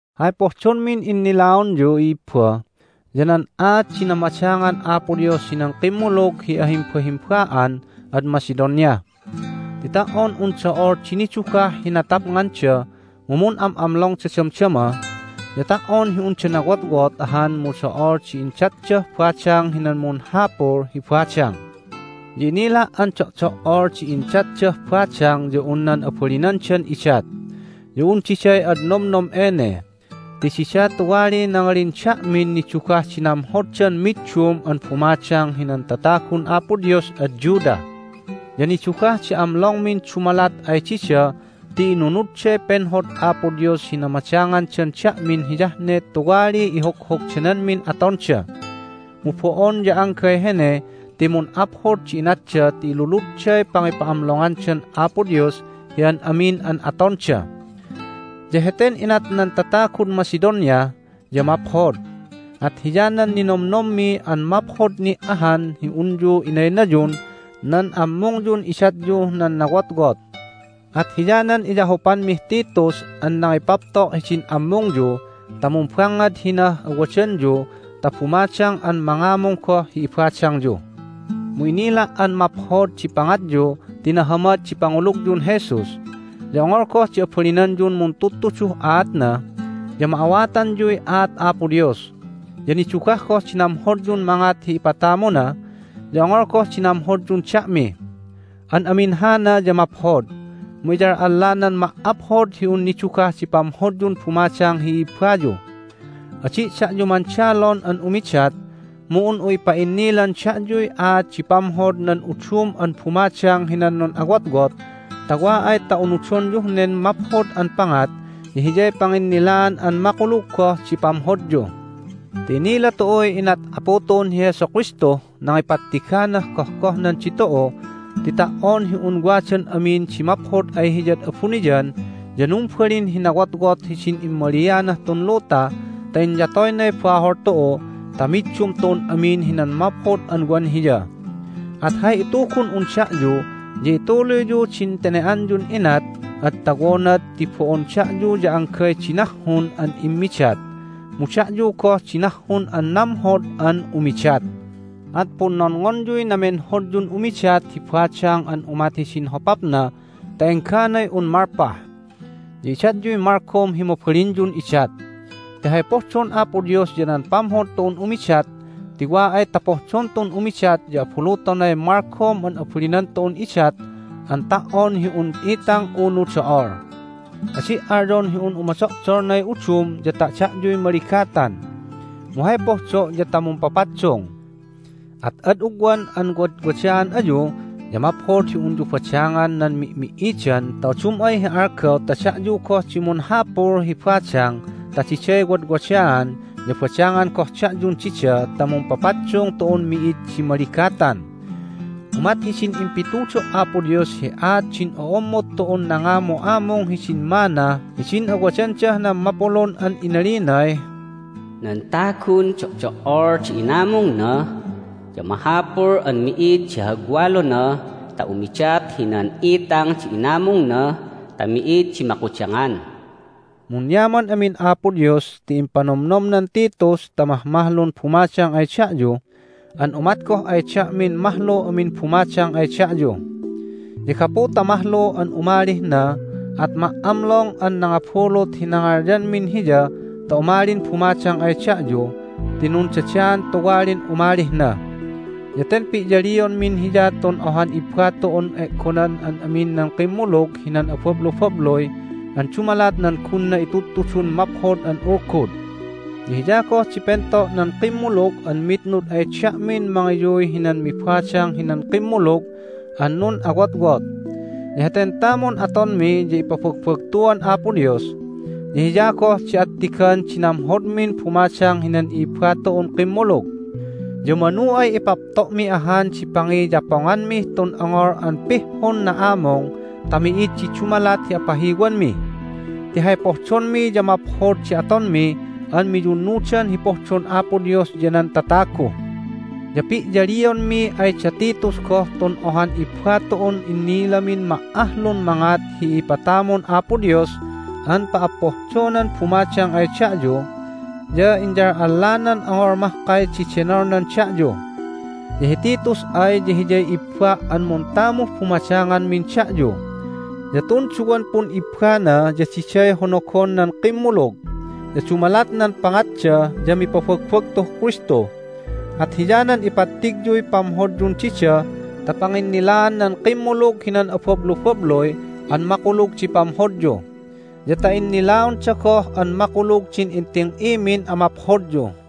Hay pohdonmin innilaonyu, i'ibba, ya nan aat di namadangan Apo Dios hinan kimmulug hi ahimbahimba'an ad Macedonia. Ti ta"on un do'ol di nidugah hi natapnganda mu mun'am'amlongda damdama, ya ta"on hi unda nawotwot ahan mu do'ol di indatdah badang hinan munhapul hi badang. Ya inila' an do'do"ol di indatdah badang ya un nan abalinandan idat. Ya un diday ad nomnom ene ti dida tuwaliy nangalin da'min nidugah di namhoddan middum an bumadang hinan tatagun Apo Dios ad Judah. Ya nidugah di amlongmin dumalat ay dida ti inunudday penhod Apo Dios hi namadangandan da'min hiyah ne tuwaliy ihoghogdananmin atonda. Mu bo'on ya anggay hene ti mun'aphod di inatda ti iluludday pangipa'amlongandan Apo Dios hi an amin an atonda. Ya heten inat nan tatagud Macedonia ya maphod, at hiyanan ninomnommi an maphod ni' ahan hi unyu inaynayun nan ammungyun idatyuh nan nawotwot. At hiyanan iyahupanmih Titus an nangipapto' hidin ammungyu ta mumbangngad hinah awadanyu ta bumadang an mangamung goh hi ibadangyu. Mu inila' an maphod di pangatyu ti nahamad di pangulugyun Jesus, ya ongol goh di abalinanyun muntudtuduh aatna, ya ma'awatanyuy aat Apo Dios. Ya nidugah goh di namhodyun mangat hi ipatamuna, ya ongol goh di namhodyun da'mi. An amin hana ya maphod, mu iyal'allanan ma"aphod hi un nidugah di pamhodyun bumadang hi i'ibbayu. Adi' da'yu mandalon an umidat, mu un'u ipa'innilan da'yuy aat di pamhod nan udum an bumadang hinan nun'awotwot ta wa ay ta unudonyuh nen maphod an pangat ya hiyay panginnilaan an makulug goh di pamhodyu. Ti inila tu'uy inat Apu tu'un hi Jesu Kristuh nangipattiganah gohgohnan ditu'u ti ta"on hi un wadan amin di maphod ay Hiyad abuniyan ya numbalin hi nawotwot hidin immalianah tun luta ta inyatoynay bahol tu'u ta middum tu'un amin hinan maphod an wan Hiya. At hay itugun'un da'yu ya ituluyyu din tene"anyun inat ad tawonad ti bo'on da'yu ya anggay di nahhun an immidat, mu da'yu goh di nahhun an namhod an umidat. At punnonngonyuy namenhodyun umidat hi badang an umat hidin hopapna ta engganay un malpah. Ya idatyuy malgom hi mabalinyun idat. Ti hay pohdon Apo Dios ya nan pamhod tu'un umidat. Ti wa ay ta pohdon tu'un umidat ya abulutonay malgom an abalinan tu'un idat an ta"on hi un itang unu do'ol. Adi' alyon hi un umodo'dolnay udum ya ta da'yuy maligatan. Mu hay pohdo' ya ta mumpapaddung. At ad ugwan an wadwadaan ayu ya maphod hi unyu badangan nan mi'mi"idan ta udum ay hi algaw ta da'yu goh di munhapul hi badang ta diday wadwadaan ya badangan goh da'yun dida ta mumpapaddung tu'un mi'id di maligatan. Umat hidin impitudo' Apo Dios hi aat din o'ommod tu'un nangamu'amung hidin manna hidin awadandah nan mapulun an inalinay, "Nan tagun do'do"ol di inamungna ya mahapul an mi'id di hagwalona ta umidat hinan itang di inamungna ta mi'id di makudangan." Munyaman amin Apo Dios ti impanomnomnan Titus ta mahmahlun bumadang ay da'yu, an umat goh ay da'min mahlu amin bumadang ay da'yu. Ya gapu ta mahlu an umalih na at ma"amlong an nangabulut hi nangalyanmin hiya ta umalin bumadang ay da'yu ti nundadaan tuwalin umalih na. Ya ten pi'yalionmin hiya tun ohan ibba tu'un e'gonan an amin nan kimmulug hinan abablubabluy an dumalat nan gunna intudtudun Maphod an Ulgud. Ya hiya goh di pento' nan kimmulug an mitnud ay da'min mangiyuy hinan mibadang hinan kimmulug an nun'awotwot. Ya heten tamun atonmi ya ipabagbagtuan Apo Dios, ya hiya goh di attigan di namhodmin bumadang hinan i'ibba tu'un kimmulug. Ya manu ay ipapto'mi ahan di pangiyaponganmih tun ongol an pihhun na'amung ta mi'id di dumalat hi apahiwanmi. Ti hay pohdonmi ya maphod di atonmi an miyunnudan hi pohdon Apo Dios ya nan tatagu. Ya pi'yalionmi ay da Titus goh tun ohan ibba tu'un inilamin ma"ahlun mangat hi ipatamun Apo Dios an pa'appohdonan bumadang ay da'yu, ya inyal'allanan ongol mahkay di denolnan da'yu. Ya hi Titus ay ya hiyay ibba' an muntamuh bumadanganmin da'yu. Ya tun duwan pun'ibbana ya diday honogon nan kimmulug, ya dumalat nan pangatda ya mipabagbagtuh Kristu. At hiyanan ipattigyuy pamhodyun dida ta panginnilaan nan kimmulug hinan abablubabluy an makulug di pamhodyu, ya ta innilaonda goh an makulug din inting'imin amaphodyu.